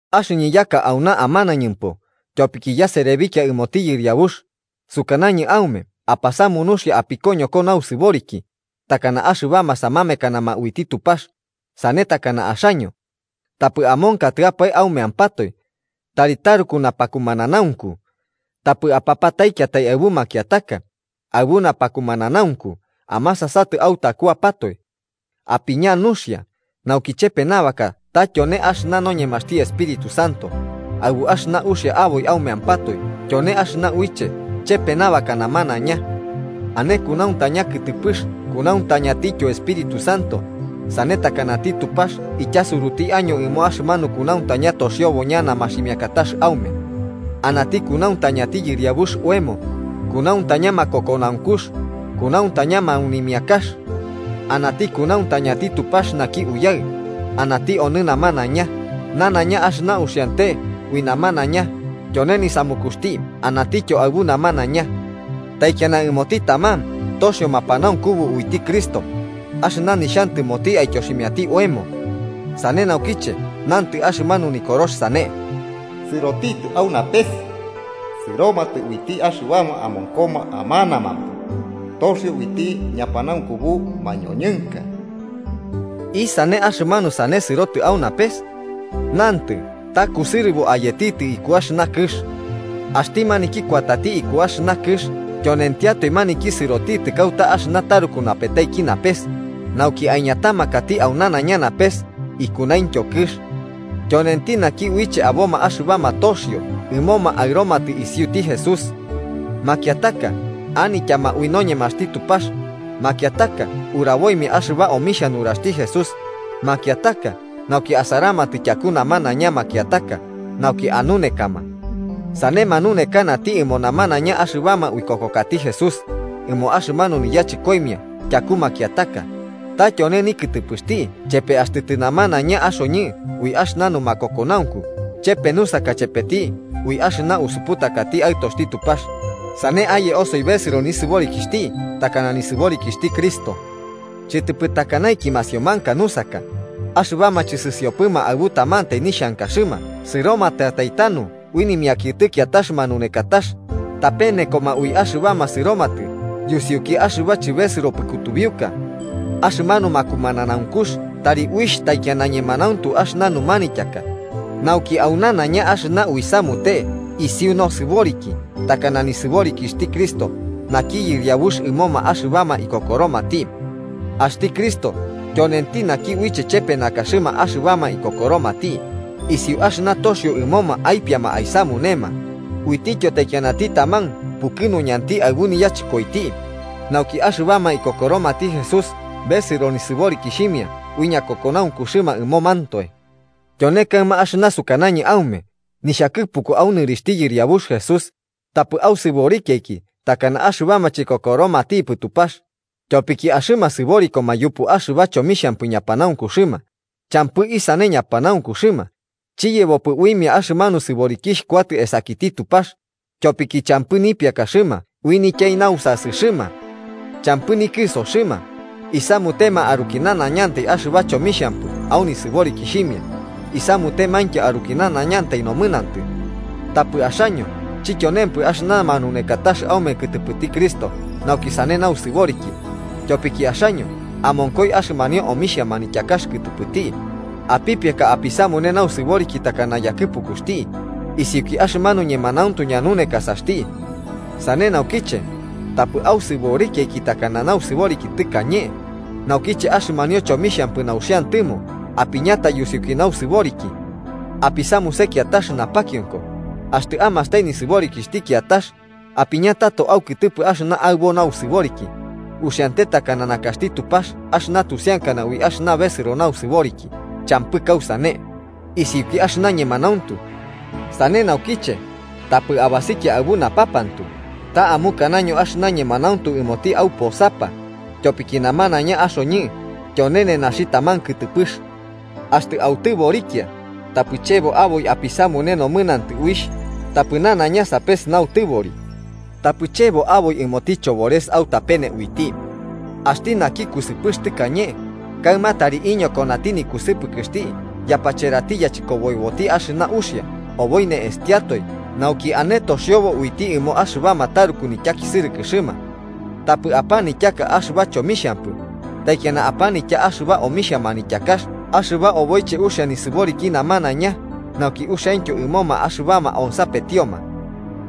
Axɨñɨ yaka auna amanañɨmpo tyopiki yaserebikia ɨmoti Yɨriabux, sukanañɨ aume apasamu nuxia apikoñoko nausɨboriki, takana axɨbama samamekanama uiti Tupax, sane tana axaño. Tapɨ amonkatɨapae aumeampatoe, tari taruku napakumananaunku. Tapɨ apapataikiatai aɨbu makiataka, aɨbu napakumananaunku amasasatɨ autakuapatoe. Apiña nuxia nauki chepe nabaka ta tyone axɨna noñemaxti Espíritu Santo, aɨbu axɨna uxia aboi aumeampatoe tyone axɨna uiche chepe nabaka namanaiña. Ane kunauntaña kɨtɨpɨx kunauntañantityo Espíritu Santo, sane takanati Tupax ityasuruti año ɨmo axɨmanu kunauntaña toxiobo ñana maximiakatax aume. Anati kunauntañati Yɨriabux oemo, kunauntaña makokonaunkux, kunauntaña maunimiakax. Anati kunauntañati Tupax naki Uyaɨ, anati onɨ namanaiña, nanaiña axɨna uxiante ui namanaiña tyone nisamukuxti anatityo aɨbu namanaiña. Taikiana ɨmoti taman toxio mapanaunkubu uiti Cristo axɨna nixhantɨmoti aityoximiati oemo. Sane naukiche nantɨ axɨmanu Nikorox sane: “Sɨrotitɨ au napes sɨromatɨ uiti axɨbama amonkoma amanamampo, toxio uiti ñapanaunkubu mañoñɨnka.” ¿Isane axɨmanu sane “sɨroti au napes”? Nantɨ ta kusɨrɨbo ayetitɨ iku axɨna kɨx. Axti maniki kuatati iku axɨna kɨx tyonentiatoe maniki sɨrotitɨ kauta axɨna taruku napetaiki napes, nauki aiñatamakati au nanaiña napes ikunaintyo kɨx. Tyonenti naki uiche aboma axɨbama toxio ɨmoma aɨromatɨ isiuti Jesús. Makiataka, anityama ui noñemaxti Tupax, makiataka uraboimia axɨba omixhia nuraxti Jesús, makiataka nauki asaramatɨ tyaku namanaiña makiataka nauki anunekama. Sane manunekanati ɨmo namanaiña axɨbama uikokokati Jesús, ɨmo axɨmanu niyachɨkoimia tyaku makiataka, ta tyone nikɨtɨpɨxti chepe axtɨ tɨnamanaiña axoñɨ ui axɨna numakokonaunku chepe nusaka chepeti ui axɨna usuputakati Aɨtoxti Tupax, sane aye osoi besɨro nosɨboriki takana nisɨborikixhti Cristo. Chɨtɨpɨ takanaiki masiomanka nusaka, axɨbama chɨsɨsiopɨma aɨbu tamantai nixhankaxɨma sɨromatɨatai tanu ui nimiakiɨtɨ kiatax manaunekatax, tapenekoma ui axɨbama sɨromtɨ yusiuki axɨba chɨbesɨropɨ kutubiuka. Axɨmanu makumananaunkux tari uixh taikiana ñemanauntu axɨna numanityaka, nauki au nanaiña axɨna uisamute isiu nosɨboriki takana nisɨborikixhti Cristo, naki Yɨriabux ɨmoma axɨbama ikokoromati. Axti Cristo tyonenti naki uiche chepe nakaxɨma axɨbama ikokoromati, isiu axɨna toxio ɨmoma aipiama aisamunema, uitiyo taikianati taman pukɨnuñanti aɨbu niyachɨkoiti, nauki axɨbama ikokoromati Jesús besɨro nisɨborikixhimia ui ñakumananaunkuxɨma ɨmomantoe. Tyone kaɨma axɨna sukanañɨ aume nixhakɨpuku au nɨrixhti Yɨriabux Jesús: tapɨ ausɨborikiaiki takana axɨbama chikokoromatipɨ Tupax, tyopiki axɨma sɨborikoma yupu axɨba chomixhampɨ ñapanaunkuxɨma champɨ isane ñapanaunkuxɨma, chiyebpopɨ uimia axɨmanu sɨborikixh kuatɨ esakiti Tupax, tyopiki champɨ nipiakaxɨma ui nityai nausasɨxɨma. Champɨ nikɨsoxɨma, isamutema aruki nanaiñantai axɨba chomixhampɨ au nisɨborikixhimia, isamutemaintyo aruki nanaiñantai nomɨnantɨ. Tapɨ axaño chityonempɨ axɨna manunekatax aume kɨtɨpɨti Cristo nauki sane nausɨboriki, tyopiki axaño amonkoi axɨmanio omixhia manityakax kɨtɨpɨti, apipiaka apisamune nausɨboriki takana yakɨpukuxti, isiuki axɨmanu ñemanauntu ñanunekasaxti. Sane naukiche, tapɨ ausɨborikiaiki takana nausɨboriki tɨkañe, naukiche axɨmanio chomixhampɨ nauxiantɨmo apiñata yusiuki nausɨboriki. Apisamuse kiatax napakionko, axtɨ amastai nisɨborikixhti kiatax, apiña tato aukɨtɨpɨ axɨna aɨbo nausɨboriki, uxiante takana nakaxti Tupax axɨna tusiankana ui axɨna besɨro nausɨboriki champɨ kausane, isiuki axɨna ñemanauntu. Sane naukiche, tapɨ abasikia aɨbu napapantu, ta amukanaño axɨna ñemanauntu ɨmoti auposapa, tyopiki namanaiña axoñɨ tyone nenaxi taman kɨtɨpɨx. Axtɨ autɨborikia, tapɨ chebo aboi apisamune nomɨnantɨ uixh, tapɨ nanaiña sapes nautɨbori, tapɨ chebo aboi ɨmoti chobores autapene uiti. Axti naki kusɨpɨx tɨkañe, kaɨma tari iñokonati nikusɨpɨkɨxti yapacherati yachɨkoboiboti axɨna uxia, oboi ne'estiatoe nauki ane toxiobo uiti ɨmo axɨbama taruku nityakisɨrɨkɨxɨma. Tapɨ apanityaka axɨba chomixhampɨ, taikiana apanitya axɨba omixhia manityakax axɨba oboiche uxia nisɨboriki namanaiña nauki uxiaintyo ɨmoma axɨbama onsapetioma.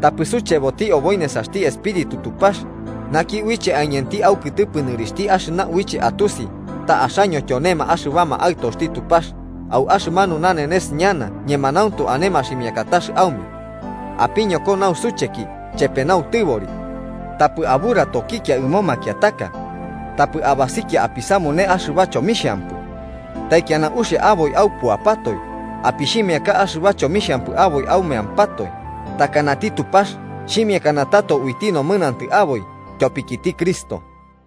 Tapɨ sucheboti aboi nesaxti Espíritu Tupax, naki uiche aiñanti aukɨtɨpɨ nɨrixhti axɨna uiche atusi ta axaño tyonema axɨbama aɨtoxti Tupax au axɨmanu nanenes ñana ñemanauntu ane maximiakatax aume. Apiñoko nausucheki chepe nautɨbori. Tapɨ aburatokikia ɨmo makiataka. Tapɨ abasikia apisamune axɨba chomixhampɨ. Taikiana uxia aboi aupuapatoe, apixhimiaka axɨba chomixhampɨ aboi aumeampatoe, takanati Tupax xhimiakana tato uiti nomɨnantɨ aboi tyopikiti Cristo.